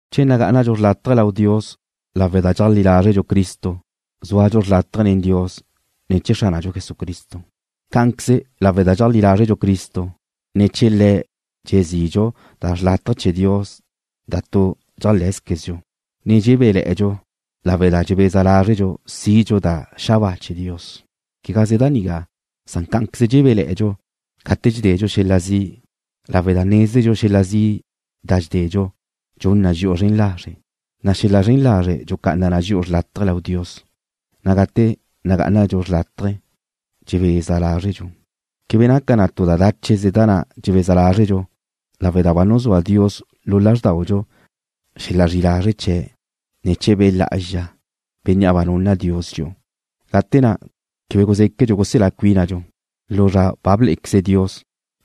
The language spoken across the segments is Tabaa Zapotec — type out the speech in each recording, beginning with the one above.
Che nagá'anadxu xrlátaje lau Dios lawe' da dxeajlí lázredxu Cristo zúadxu xrlátaje nen Dios ne̱ chee̱ Xránadxu Jesucristo. Cá'anqueze lawe' da dxeajlí lázredxu Cristo, ne̱ chee̱ Le̱' dxezidxu da xrlátaje chee̱ Dios da tu dxeajlé̱zquezdxu, ne dxebéle̱'e̱dxu lawe' da dxebeza lázredxu sidxu da xabáa chee̱ Dios. Quegaze da nigá, san cá'anqueze dxebéle̱'e̱dxu gate dxededxu xel-la zi', lawe' da nézedxu xel-la zi' da dxededxu dxun na dxi'u zren lazre', na' xel-la zren lazre' dxucá'ana na dxi'u xrlátaje lau Dios, na' gate nagá'anadxu xrlátaje dxebeza lázredxu. Quebe naca tu da dácheze da na' dxebeza lázredxu lawe' da ba nuzúa Dios lu lázrdaudxu xel-la zri'i lazre' chee̱' ne̱ chee̱ Be' Lá'azxa, Bénnea' ba nunna Dios dxi'u. Gate na' quebe guzéquedxu guselá cuínadxu, lu zra blé'equeze Dios,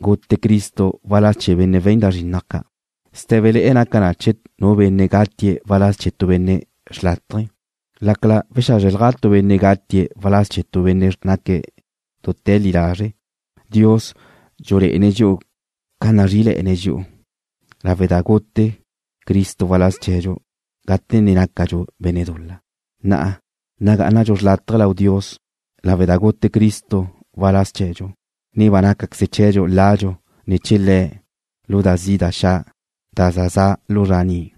gute Cristo waláz chee̱ benne' we̱n da zrinnaj ca'. Sté̱bele̱'e̱ naca che nu benne' gatie̱' waláz chee̱ tu benne' xrlátaje, lácala wexázrelja tu benne' gatie̱' waláz chee̱ tu benne' naque̱' dute̱ li lazre'. Dios dxulé'ene̱' dxi'u ca nazrí'ile̱'e̱ne̱' dxi'u lawe' da gute Cristo waláz chee̱dxu gate ne nácadxu benne' dul-la. Na'a nagá'anadxu xrlátaje lau Dios lawe' da gute Cristo waláz chee̱dxu, ne ba nácaqueze chee̱dxu ladxu ne̱ chee̱ Le̱' lu da zi' da xa', da za za' lu zra ni'.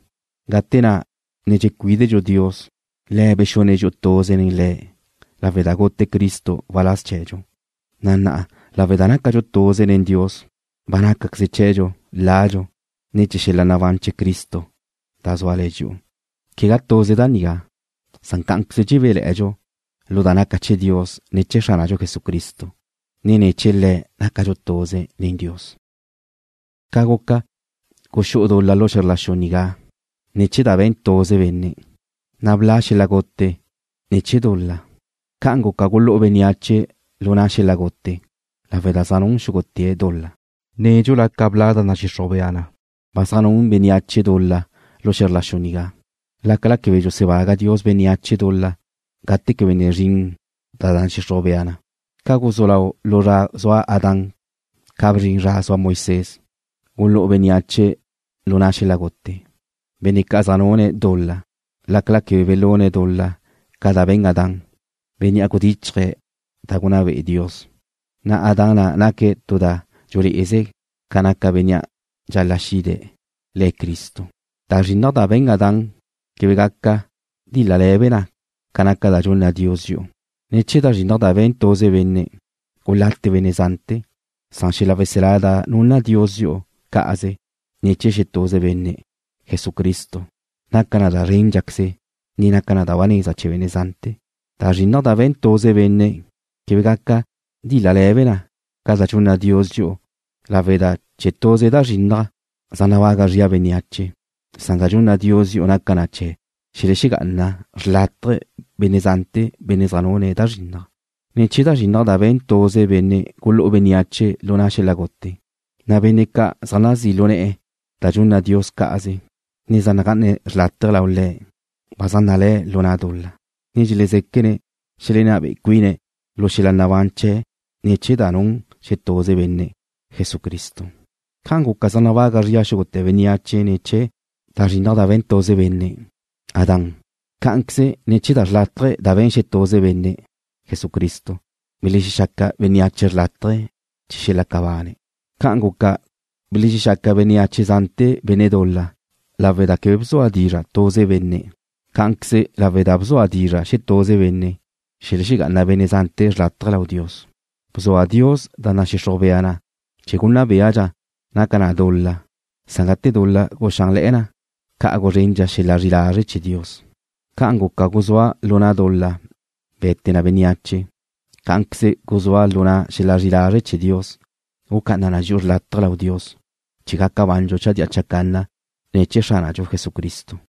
Gate na' ne dxecuídedxu Dios, Le̱' bexune̱' dxi'u tuze nen Le̱' lawe' da gute Cristo waláz chee̱dxu, na' na'a lawe' da nácadxu tuze nen Dios ba nácaqueze chee̱dxu ladxu ne̱ chee̱ xel-la nabán chee̱ Cristo da zúale̱ na dxi'u. Quegá tuze da nigá, san cá'anqueze dxebéle̱'e̱dxu lu da naca chee̱ Dios ne̱ chee̱ Xránadxu Jesucristo, ne ne̱ chee̱ Le̱' nácadxu tuze nen Dios. Ca guca, guxú'u dul-la lu xe̱zr la xu nigá ne̱ chee̱ da be̱n tuze benne', na' bla' xel-la gute ne̱ chee̱ dul-la, ca'an guca gulú'u bénneache lu na' xel-la gute lawe' da zaj nun xúgute̱' dul-la. Nédxula ca bla' da nadxixruj bea na, ba zaj nun bénneache dul-la lu xe̱zr la xu nigá, lácala quebe dxusebaga Dios bénneache dul-la gate quebe ne zrin da nadxixruj bea na. Ca guzú lau lu zra zua Adán ca bzrin zra zua Moisés, gulú'u bénneache lu na' xel-la gute, benne' ca' zaj nune̱' dul-la, lácala quebe belune̱' dul-la ca da be̱n Adán, bénnea' gudichje̱' da gunná be'e Dios, na' Adán na' naque̱' tu da dxulé'eze na ca naca Bénnea' dxal-la' xide̱', Le̱' Cristo. Da zrinnaj da be̱n Adán quebe gaca díl-lale̱be na ca da dxunna Dios dxi'u. Ne̱ chee̱ da zrinnaj da be̱n tuze benne', gulate benne' zante̱, san xel-la weselá da nunna Dios dxi'u cá'aze ne̱ chee̱ xetuze benne', Jesucristo, naca na da zréndxaqueze, ne naca na da ba neza chee̱ benne' zante̱. Da zrinnaj na' da be̱n tuze benne' quebe gaca díl-lale̱be na ca da dxunna Dios dxi'u lawe' da ne̱ chee̱ tuze da zrinnaj, zaj nabaga zria bénneache, san da dxunna Dios dxi'u naca na chee̱ xelexegá'ana xrlátaje benne' zante̱ benne' zaj nune̱' da zrinnaj. Ne̱ chee̱ da zrinnaj da be̱n tuze benne' gulú'u bénneache lu na' xel-la gute, na' benne' ca' zaj nazí' lu ne̱'e̱ da dxunna Dios cá'aze, ne zaj nagá'ane̱' xrlátaje lau Le̱' ba zaj nalé̱' lu na' dul-la, ne dxelezéquene̱' xelenná be'e cuine̱' lu xel-la nabán chee̱' ne̱ chee̱ da nun xetuze benne', Jesucristo. Ca guca zaj nabaga zria xúgute̱ bénneache ne̱ chee̱ da zrinnaj da be̱n tuze benne', Adán, cá'anqueze ne̱ chee̱ da xrlátaje da be̱n xetuze benne', Jesucristo, belexexaca bénneache xrlátaje chee̱ xelaca bane̱'. Ca guca belexexaca bénneache zante̱ benne' dul-la lawe' da quebe bzua dizra' tuze benne', cá'anqueze lawe' da bzua dizra' xetuze benne', xelexegá'ana benne' zante̱ xrlátaje lau Dios. Bzua Dios da nadxixruj bea na chee̱ gunná béadxa na da naca dul-la, na' gate dul-la guxánle̱'e̱ na, ca' guzrendxa xel-la zri'i lazre' chee̱ Dios. Ca naca zua lu na' dul-la gute na bénneache, cá'anqueze zua lu na' xel-la zri'i lazre' chee̱ Dios gucá'ana na dxi'u xrlátaje lau Dios chee̱ gaca bandxu chadía chacanna ne̱ chee̱ Xránadxu Jesucristo.